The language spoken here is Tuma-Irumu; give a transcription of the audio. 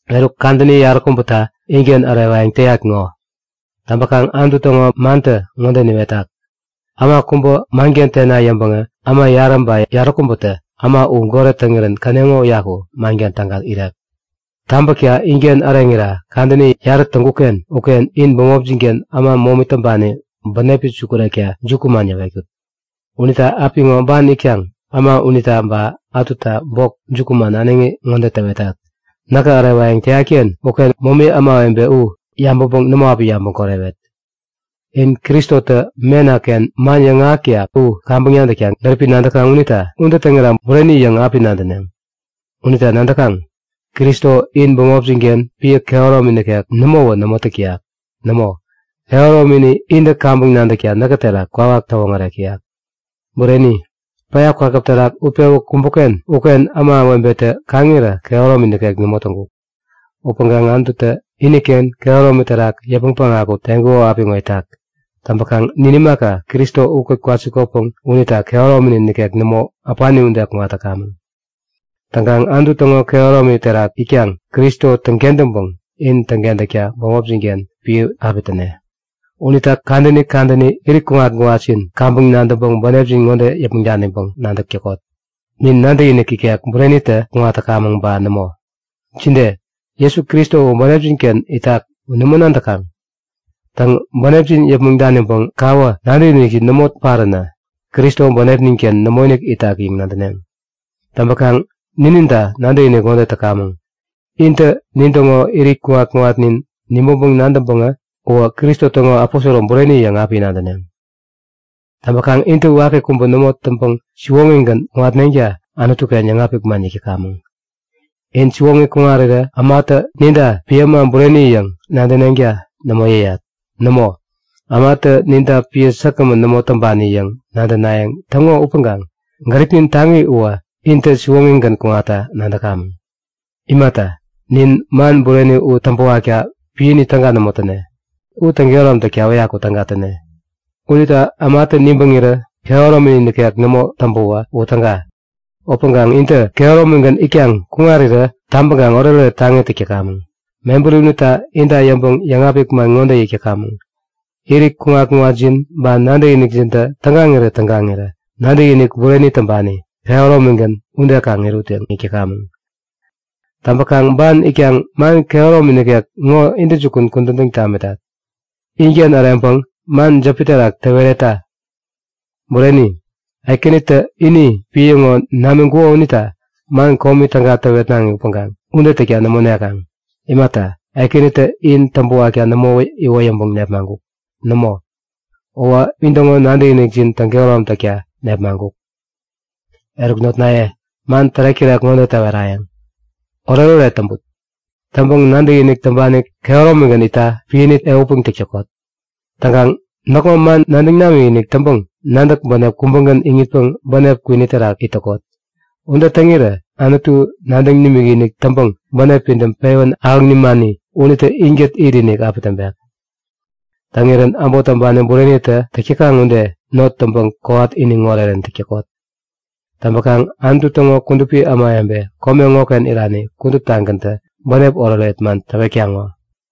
Eruk kadäni yaräkubäta inken ärewayäŋ täyat ŋo. Täŋpäkaŋ Anutu täŋo mantä ŋode niwetak; Äma kubä manken tena yäŋpäŋä äma yarä ba yaräkubätä äma u goret täŋirän käneŋo uyaku manken täga irek. Tabäkta inken äreŋira kadäni yarä täŋkuk-ken uken in bämopjin-ken äma momi täŋpani bänepi sukurekta jukuman yäwetkut. Unita apiŋo ban itkaŋ äma unita ba ätuta bok jukuman äneŋi ŋode täwetat; Näkä ärewayäŋ täyat-ken uken momi ämawebe u yabäŋpäŋ nämo api yabäŋ korewet. In Kristotä mena-ken man yäŋahäk täyak u kaŋpäŋ nadäkta gäripi nadäkaŋ unita ude täŋira bureni yäŋ api nadäneŋ. Unita nadäkaŋ? Kristo in bämopjin-ken piä kehäromi nikek nämowä nämo täk täyak. Nämo, kehäromini intä kaŋpäŋ nadäkta näkä terak kwawak täwoŋärek täyak. Bureni, päya kwakäp terak utpewä kumbuk-ken uken ämawebetä kaŋirä kehäromi nikek nämo täŋkuk. Upäŋkaŋ Anututä iniken kehäromi terak yäpmäŋ päŋaku teŋkuko apiŋo itak. Täŋpäkaŋ nin imaka, Kristo ukät kwasikotpäŋ unita kehärominin nikek nämo, äpani ude kuŋat täkamäŋ. Täŋkaŋ Anutu täŋo kehäromi terak itkaŋ Kristo täŋkentäŋpäŋ in täŋkentäkta bämopjin-ken piä api täne. Unita kadäni kadäni irit kuŋat-kuŋatjin kaŋpäŋ nadäŋpäŋ bänepjin ŋode yäpmäŋ daniŋpäŋ nadäk täkot; Nin nadäkinik ikek burenitä kuŋatkamäŋ ba nämo? Jide? Jesu Kristo u bänepjin-ken itak u nämo nadäkaŋ? Täŋ, bänepjin yäpmäŋ daniŋpäŋ kawä nadäkinikjin nämo paränä Kristo bänepnin-ken nämoinik itak yäŋ nadäneŋ. Täŋpäkaŋ nininta nadäkinik ŋode täkamäŋ; Intä nintäŋo irit kuŋat-kuŋatnin nibäŋpäŋ nadäŋpäŋä uwä Kristo täŋo aposoro bureni yäŋ api nadäneŋ. Täŋpäkaŋ intä waki kubä nämo täŋpäŋ siwoŋigän kuŋatneŋta Anutu-ken yäŋapik man yäk täkamäŋ. In siwoŋi kuŋarirä ämatä ninta piä äma bureni yäŋ nadäneŋta nämo yäyat. Nämo, ämatä ninta piä säkgämän nämo täŋpani yäŋ nadänayäŋ täŋo upäŋkaŋ gäripnin taŋi uwä intä siwoŋigän kuŋatta nadäkamäŋ. Imata, nin man bureni u täŋpäwakta piäni täga nämo täne, u täŋkehärom takta uyaku täga täne. Unita ämatä nibäŋirä kehärominin nikek nämo täŋpäwä u täga. Upäŋkaŋ intä kehäromigän itkaŋ kuŋarirä tabäŋkaŋ oretoret taŋi täk täkamäŋ. Mebäri unita inta yäŋpäŋ yäŋapik man ŋode yäk täkamäŋ; Irit kuŋat-kuŋatjin ba nadäkinikjintä tägaŋirä-tägaŋirä nadäkinik bureni täŋpani, kehäromigän ude kaŋ irut yäŋ yäk täkamäŋ. Täŋpäkaŋ ban itkaŋ man kehäromi nikek ŋo intäjukun kudän täŋ tamitat. Inken äreŋpäŋ man jäpi terak täweretta! Bureni, Ekänitä ini piä ŋo namiŋkuko unita man komi täga täwetnaŋi upäŋkaŋ ude täkta nämo nekaŋ. Imata, Ekänitä in täŋpäwakta nämo iwoyäŋpäŋ nepmaŋkuk. Nämo, uwä intäŋo nadäkinikjin täŋkehärom takta nepmaŋkuk. Eruk notnaye, man tärek-tärek ŋode täwerayäŋ; Oretoret täŋput! Täŋpäŋ nadäkinik täŋpani kehäromigän itta piäni ehutpäŋ täk täkot. Täŋkaŋ näkŋo man nadäŋ namikinik täŋpäŋ nadäk bänep kubägän iŋitpäŋ bänep kwini terak it täkot. Ude täŋirä Anutu nadäŋ nimikinik täŋpäŋ bänep pidäm pewän ahäŋ nimani unitä inkät itinik api täŋpek. Täŋirän äbot täŋpani burenitä täk täkaŋ ude not täŋpäŋ kowat iniŋ orerän täk täkot. Täŋpäkaŋ Anutu täŋo kudupi ämawebe kome ŋoken irani kuduptagäntä bänep oretoret man täwetkaŋ ŋo.